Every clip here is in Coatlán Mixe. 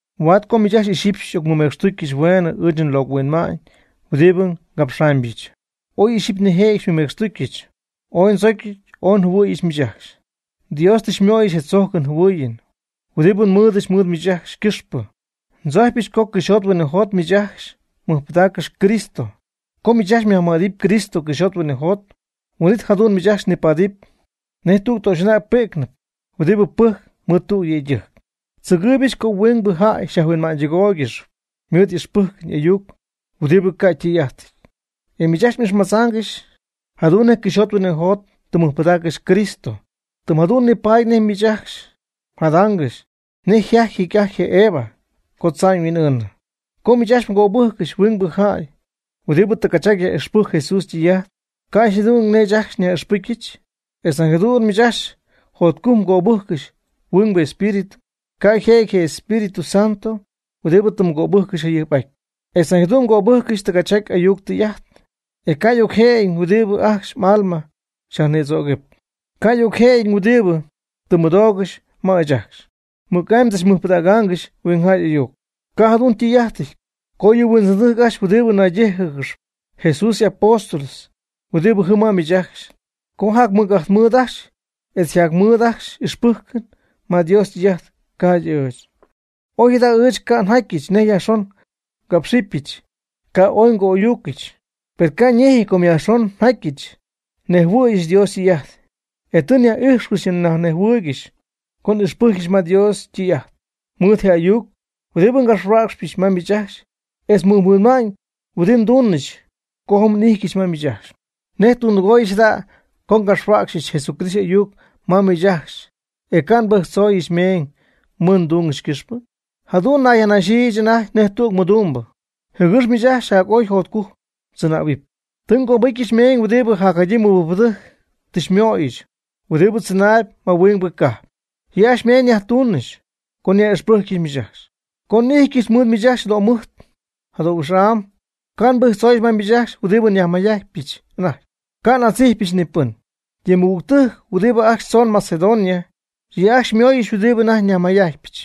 Huaad co miich ajcxy ixyipy xy'ocmɨmecxtujcɨch hueenɨ ɨɨch nlocɨ huinma'ñ huɨdibɨ ngapxaamybɨch. Oy ixyipy ñejɨty mɨmecxtuccɨch. Ooy ndzocy ooy njɨhuɨ̈yɨch miich ajcxy. Dios tɨ xymöyɨch je tzojcɨn jɨhuɨɨyɨn huɨdibɨ nmɨɨdɨch mɨɨd miich ajcxy ycɨxpɨ. Ndzojcypɨch co cɨxyjot huinɨjot miich ajcxy mmɨjpɨdaaccɨxy Cristo. Co miich ajcxy yajmɨj'adɨp Cristo cɨxyjot huinɨjot, huin'it jadu'n miich ajcxy nipaadɨpy nej tüg töxy'anäg pi'cnɨp huɨdibɨ pɨjcp mɨɨd tüg yëydɨjc. Ndzɨgɨɨybɨch co huingbɨ jäy xyajhuinma'ñydɨgoyaangɨxy mɨɨd ixpɨcytɨjc y'ayuc huɨdibɨ ca' ytɨy'ajtɨty. E miich ajcxy m'ixmadzaangɨxy jadu'n nej cɨxyjot huinɨjot tɨ mmɨjpɨdaaccɨxy Cristo. Tɨm jadu'n nipada'ñ miich ajcxy mjadaangɨxy nej yjajty jecy'ajty je Eva co tza'ñ yhuin'ɨɨnɨ. Com miich ajcxy mgöbɨjccɨxy huingbɨ jäy huɨdibɨ tɨgachjaty yaj'ixpɨjcp Jesús ytɨy'ajt, ca' yjadu'nɨty nej ɨɨch ajcxy nyaj'ixpɨcyɨch. Etz nañ jadu'n miich ajcxy jotcujc mgöbɨjccɨxy huingbɨ espíritu, ca' yjëjɨty je Espíritu Santo huɨdibɨ tɨ mgöbɨjccɨxy jayɨjp'aty. Etz nañ jadu'n mgöbɨjccɨxy tɨgachjaty ayuc tɨy'ajt, e ca' y'ocjëjɨñ huɨdibɨ ajcxy m'alma xyajnïdzoocɨp. Ca' y'ocjëjɨñ huɨdibɨ tɨ mmɨdoogɨxy ma ɨɨch ajcxy. Mɨc'amy mdzachmɨjpɨdaaccɨxy huingjäy y'ayuc. Ca' jadu'n ytɨy'ajtɨty co yɨ huindzɨndɨjc ajcxy huɨdibɨ naydíjɨgɨxp Jesús y'apóstol huɨdi jɨm ma miich ajcxy, co jac mɨc'ajt mɨɨd ajcxy etz yjacmɨɨd ajcxy ixpɨjcɨn ma Dios ytɨy'ajt, ca'ydɨ ɨɨch. Oy ɨɨch jada' ca' njatyɨch nej yajxon ngápxɨbɨch, ca' ooy ngo'ayúcɨgɨch. Per ca' ñejɨty com yajxon njatyɨch nnejhuɨɨyɨch Dios ytɨy'ajt. E tɨ nyaj'ijxcɨxy nyajnejhuɨɨygɨxy co n'ixpɨ́cycɨgɨch ma Dios ytɨy'ajt mɨɨd je ayuc huɨdibɨ ngapxhuäcxɨch ma miich ajcxy etz je mɨjhuinma'ñ huɨdi nduunɨch co jɨm n'ijtyɨch ma miich ajcxy. ¿Nej tundɨgoyɨch jada' co ngapxhuäcxyɨch Jesucristo y'ayuc ma miich ajcxy e ca' nbɨjctzooyɨch meeñ mɨɨd ndungɨch ycɨxpɨ? Jadu'n nnayyajnajxɨch anajty nej tüg mɨdumbɨ jɨgɨx miich ajcxy jac'oy jacjotcujc mdzɨnähuɨp. Tɨ ngöbɨcyɨch meeñ huɨdibɨ jacjadyii mɨbɨjcpɨdɨjc tɨ xymöyɨch huɨdibɨ tzɨnaayb ma huingbɨ cajp. Yɨ' ajcxy ymeeñ nyajtuunɨch co nyaj'ixpɨjcyɨch miich ajcxy. Co n'ijtyɨch mɨɨd miich ajcxy jadöjɨmɨjt jadöhuix'am ca' nbɨjtzooyɨch ma miich ajcxy huɨdibɨ nyajmayjajtpyɨch anajty. Ca' n'adzijpyɨch ni pɨn. Yɨ mɨgügtɨjc huɨdibɨ ajcxy tzoon Macedonia, yɨ' ajcxy xymooyɨch huɨdibɨ anajty nyajmayjajtypɨch,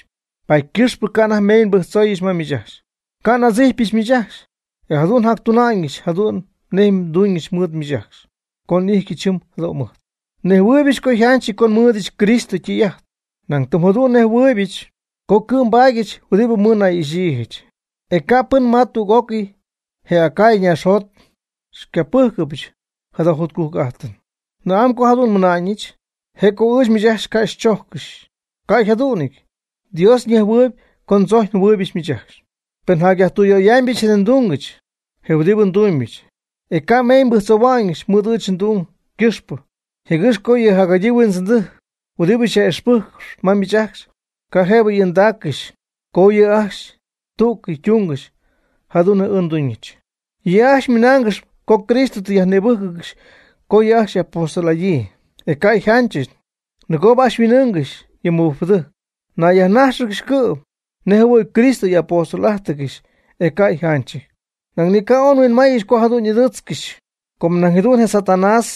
paady ycɨxp ca' anajty meeñ nbɨjctzooyɨch ma miich ajcxy, ca' n'adzijpɨch miich ajcxy. E jadu'n njactuna'ñɨch jadu'n nej nduuñɨch mɨɨd miich ajcxy co n'ijtyɨch jɨm jadöjɨmɨjt. Nejhuɨɨybɨch co yjanchɨty co nmɨ́ɨdɨdyɨch Cristo ytɨy'ajt, nañ tɨm jadu'n nnejhuɨ̈yɨch co cɨ'm nbaadyɨch huɨdibɨ mɨɨdnay'ixyiijɨch. E ca' pɨn ma tüg'ócɨy je Acaya naaxjot xycapɨ́jcɨbɨch jada jotcujc'ajtɨn. ¿Na'amy co jadu'n nmɨna'ñɨch? ¿Je' co ɨɨch miich ajcxy ca' ndzojccɨxy? Ca' yjadu'nɨty. Dios ñejhuɨɨyb co ndzocy njɨhuɨ̈yɨch miich ajcxy. Per njacyajtüyöyaamybɨch je ndungɨch huɨdibɨ ndumybɨch, e ca' meeñ nbɨjctzohua'ñɨch mɨɨd ɨɨch ndung ycɨxpɨ jɨgɨx co yɨ jacjadyii huindzɨndɨjc huɨdibɨ yaj'ixpɨjccɨxp ma miich ajcxy, ca' jëbɨ y'ɨɨndaaccɨxy co yɨ' ajcxy tú'cɨy ytungɨxy jadu'n nej ɨɨch nduuñɨch. Yɨ' ajcxy ymɨnaangɨxy co Cristo tɨ yajnïbɨ́jcɨgɨxy co ajcxy yɨ' y'apóstol'adyii, e ca' yjanchɨty, nɨgoob ajcxy huin'ɨɨngɨxy yɨ mɨbɨjcpɨdɨjc. Ñayyajnájxɨgɨxy cɨ'm nej jɨhuɨ̈y Cristo y'apóstol'ájtɨgɨxy, e ca' yjanchɨty. Nañ ni ca' oy nhuinmaayɨch co jadu'n ɨdɨɨtzcɨxy, com nañ jadu'n je Satanás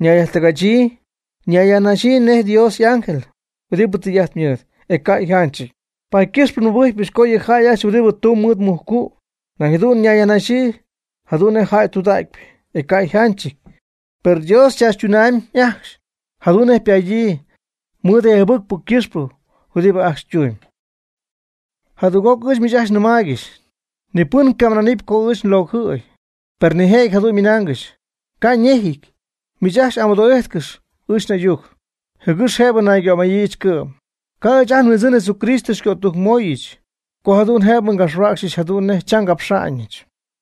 ñayyajtɨgachyii ñayyajnaxyii nej Dios y'ángel huɨdibɨ tɨy'ajt mɨɨd, e ca' yjanchɨty. Paady ycɨxp nmɨbɨjcpɨch co yɨ jäy ajcxy huɨdibɨ tumb mɨɨd je mujcu' nañ jadu'n nayyajnaxyii jadu'n nej jäy tudägypɨ, e ca' yjanchɨty. Per Dios chaachytunamyb ajcxy jadu'n nej ypadyii mɨɨd je jɨbɨcpɨ ycɨxpɨ huɨdibɨ ajcxy ytumyb. Jadüg'oc ɨɨch miich ajcxy nnɨmaaygɨxy: Ni pɨn ycamɨna'nɨpy co ɨɨch locɨjɨty. Per pen nijëjɨty jadu'n ymɨnaangɨxy, ca' ñejɨty. Miich ajcxy amɨdoo'ijtcɨx ɨɨch n'ayuc, jɨgɨx jëbɨ naygömayiijɨch cɨ'm. Ca' ɨɨch ajt nHuindzɨn Jesucristo xycötujcmöyɨch, co jadu'n jëbɨ ngapxyɨch jadu'n nej cham ngapxa'ñɨch.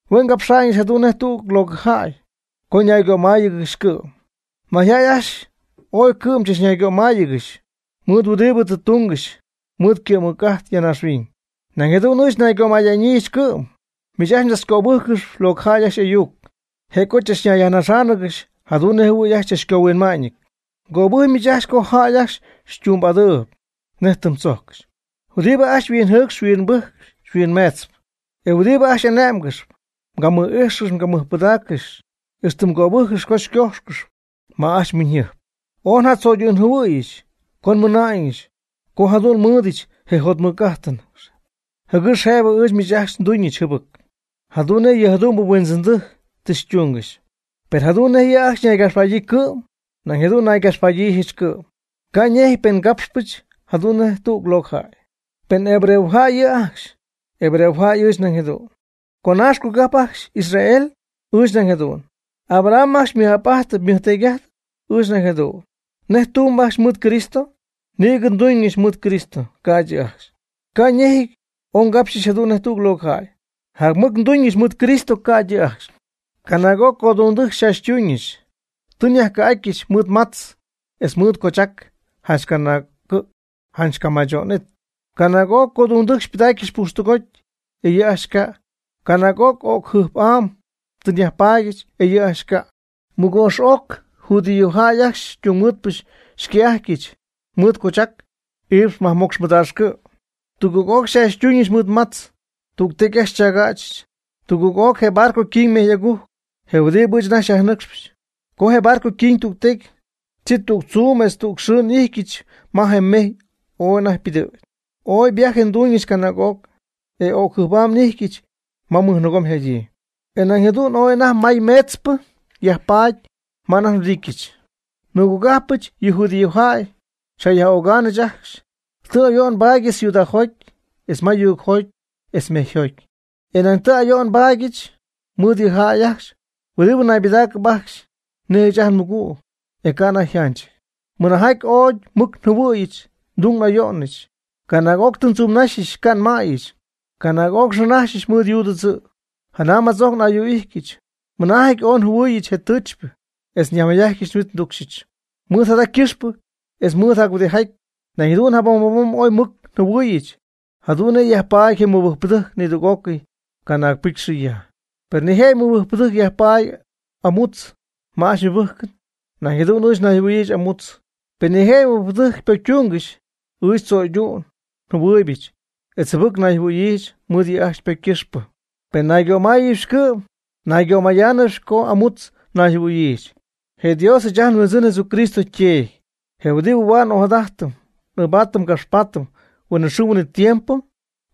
Hue' ngapxa'ñɨch jadu'n nej tüg locɨ jäy co naygömaya'ñyiijɨch cɨ'm. Mayjäy ajcxy ooy cɨ'm chachnaygömayáanɨgɨxyp mɨɨd huɨdibɨ tɨ tungɨxy mɨɨd ycɨ'm mɨc'ajt ya naaxhuiñ. Nañ jadu'n ɨɨch nnaygömaya'ñyiijɨch cɨ'm. Miich ajcxy mdzachcöbɨjccɨxyp locɨ jäy ajcxy y'ayuc, je' co mdzachnayyajnaxáanɨgɨxy jadu'n nej jɨhuɨ̈y ajcxy ooy mdzachcohuinma'ñɨty. Mgöbɨjcpy miich ajcxy co jäy ajcxy xytumbɨ'adɨɨyb nej tɨm tzojccɨxy, huɨdibɨ ajcxy xyhuinjɨcxp xyhuimbɨjcp xyhuimmeetzp, e huɨdibɨ ajcxy xy'ane'mgɨxp, xycamɨj'ijxcɨxy xycamɨjpɨdaaccɨxy, ixtɨ mgöbɨjccixyp co xycojxcɨxy ma ajcxy mhuiñyjɨjp. Oy njatzo'ydu'njɨhuɨ̈yɨch co nmɨna'ñɨch co ca' jadu'n nmɨ́ɨdɨdyɨch je jotmɨc'ajtɨn, jɨgɨx jëbɨ ɨɨch miich ajcxy nduuñɨch jɨbɨc, jadu'n nej yɨ jadu'mbɨ huindzɨndɨjc tɨ xytungɨxy. Per jadu'n nej yɨ' ajcxy ñaygapxpadyii cɨ'm, nañ jadu'n naygapxpada'ñyiijɨch cɨ'm. Ca' ñejɨty pen capxpɨch jadu'n nej tüg locɨ jäy. Pen hebreojäy yɨ' ajcxy, hebreojäy ɨɨch nañ jadu'n. ¿Conaax cogajp ajcxy Israel? Ɨɨch nañ jadu'n. ¿Abraham ajcxy ymɨj'ap'ajtpy ymɨjteedy'ajtpy? Ɨɨch nañ jadu'n. ¿Nej tumb ajcxy mɨɨd Cristo? Nïgɨ nduñyɨch mɨɨd Cristo, ca'ydɨ yɨ' ajcxy. Ca' ñejɨty oy ngapxyɨch jadu'n nej tüg locɨ jäy. Jac mɨc tɨ nduuñɨch mɨɨd Cristo ca'ydɨ yɨ' ajcxy. Canaag'oc codungdɨjc xychaachytuuñɨch. Tɨ nyajcɨ̈'atyɨch mɨɨd matz etz mɨɨd coochac janch canaag cɨ' janch ycamacho'nɨty. Canaag'oc codungdɨjc xypɨdaacyɨch pujxtɨgoty, e yɨ' ajcxy ca'. Canaag'oc o'cɨn jɨjp'am tɨ nyajpaadyɨch, e yɨ' ajcxy ca'. Mɨgoox'oc judíojäy ajcxy ytungmɨɨdpɨ xycɨ̈'ajtyɨch mɨɨd cochac iipx majmocx mɨdaax cɨ'. Tugɨɨg'oc xychaachytuuñɨch mɨɨd matz. Tügtecy ajcxy xychaagächɨch. Tugɨɨg'oc je barco yquiñ mejy'agujc je huɨdibɨ ɨɨch anajty nyajnɨcxɨɨyb. Co je barco yquiñ tügtecy, chi tüg tzuum etz tüg xɨɨ n'ijtyɨch ma je mejy anajty ooy ypɨdɨ̈gy. Ooy viaje nduuñɨch canaag'oc, e o'cjɨjp'am n'ijtyɨch ma mɨjnɨɨgom yjadyii, e nañ jadu'n ooy anajty may meetzpɨ yajpaady ma anajty nhuɨdityɨch. Nmɨgogajpɨch, yɨ judíojäy, xyjayaj'ögaanɨch ajcxy. Tɨ ayo'n nbaadyɨch ciudadjoty etz ma yuugjot etz mejyjoty. E nañ tɨ ayo'n nbaadyɨch mɨɨd jäy ajcxy huɨdibɨ naybɨdaacɨp ajcxy nej ɨɨch ajt nmɨgüg, e ca' anajty yjanchɨty. Mɨnaajɨty ooy mɨc njɨhuɨ̈yɨch ndung n'ayo'nɨch. Canaag'oc tɨ ndzumnaxyɨch ca' nmäyɨch. Canaag'oc nxɨɨnaxyɨch mɨɨd yuu tɨdzɨ̈bɨ. Janam jatzojc n'ayu'atyɨch. Mɨnaajɨty ooy njɨhuɨ̈yɨch je tɨɨchypɨ, etz nyajmayjatyɨch nhuit nducxyɨch. Mɨɨd jada ycɨxpɨ etz mɨɨd jac-huɨdijaty, nañ jadu'n jabom jabom ooy mɨc njɨhuɨ̈yɨch jadu'n nej yajpaady je mɨbɨjcpɨdɨjc nidüg'ócɨy canaag pɨcy xɨ ya. Pen nijëjɨty mɨbɨjcpɨdɨjc yajpaady amutz ma ajcxy ymɨbɨjcɨn, nañ jadu'n ɨɨch nayjɨhuɨ̈yiijɨch amutz. Pen nijëjɨty mɨbɨjcpɨdɨjc ypocytungɨxy, ɨɨch ndzo'ydu'n njɨhuɨɨybɨch etz jɨbɨc nayjɨhuɨ̈yiijɨch mɨɨd yɨ' ajcxy ypocy ycɨxpɨ. Pen naygömayaanɨbɨch cɨ'm, naygömayaanɨbɨch co amutz njɨhuɨ̈yiijɨch. Je Dios ɨɨch ajt nHuindzɨn Jesucristo yTeedy, je huɨdibɨ huaad n'ojadajtɨm n'ɨɨbaatɨm ngapxpaatɨm huinɨxɨɨ huinɨtiempo,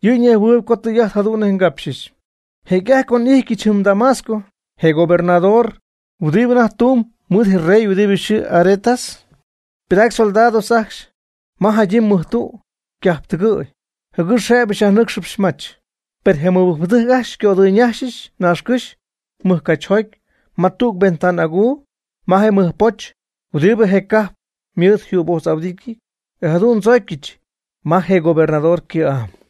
yɨ' ñejhuɨɨyb co tɨy'ajt jadu'n nej ngapxyɨch. Jecy'ajty co n'ijtyɨch jɨm Damasco, je gobernador huɨdibɨ anajty tumb mɨɨd je rey huɨdibɨ yxɨɨ Aretas, ypɨdac soldados ajcxy ma jadyii mɨjtu' ycajptɨgɨ̈y, jɨgɨx jëbɨ xyajnɨcxyɨch mach. Per je mɨbɨjcpɨdɨjc ajcxy xycodɨyñajxɨch naaxcɨ́xy mɨjcachjoty ma tüg ventana aguu ma je mɨjpoch huɨdibɨ je cajp mɨɨd yjübojtz'ahuɨdityɨty. E jadu'n ndzoocyɨch ma je gobernador ycɨ̈'am.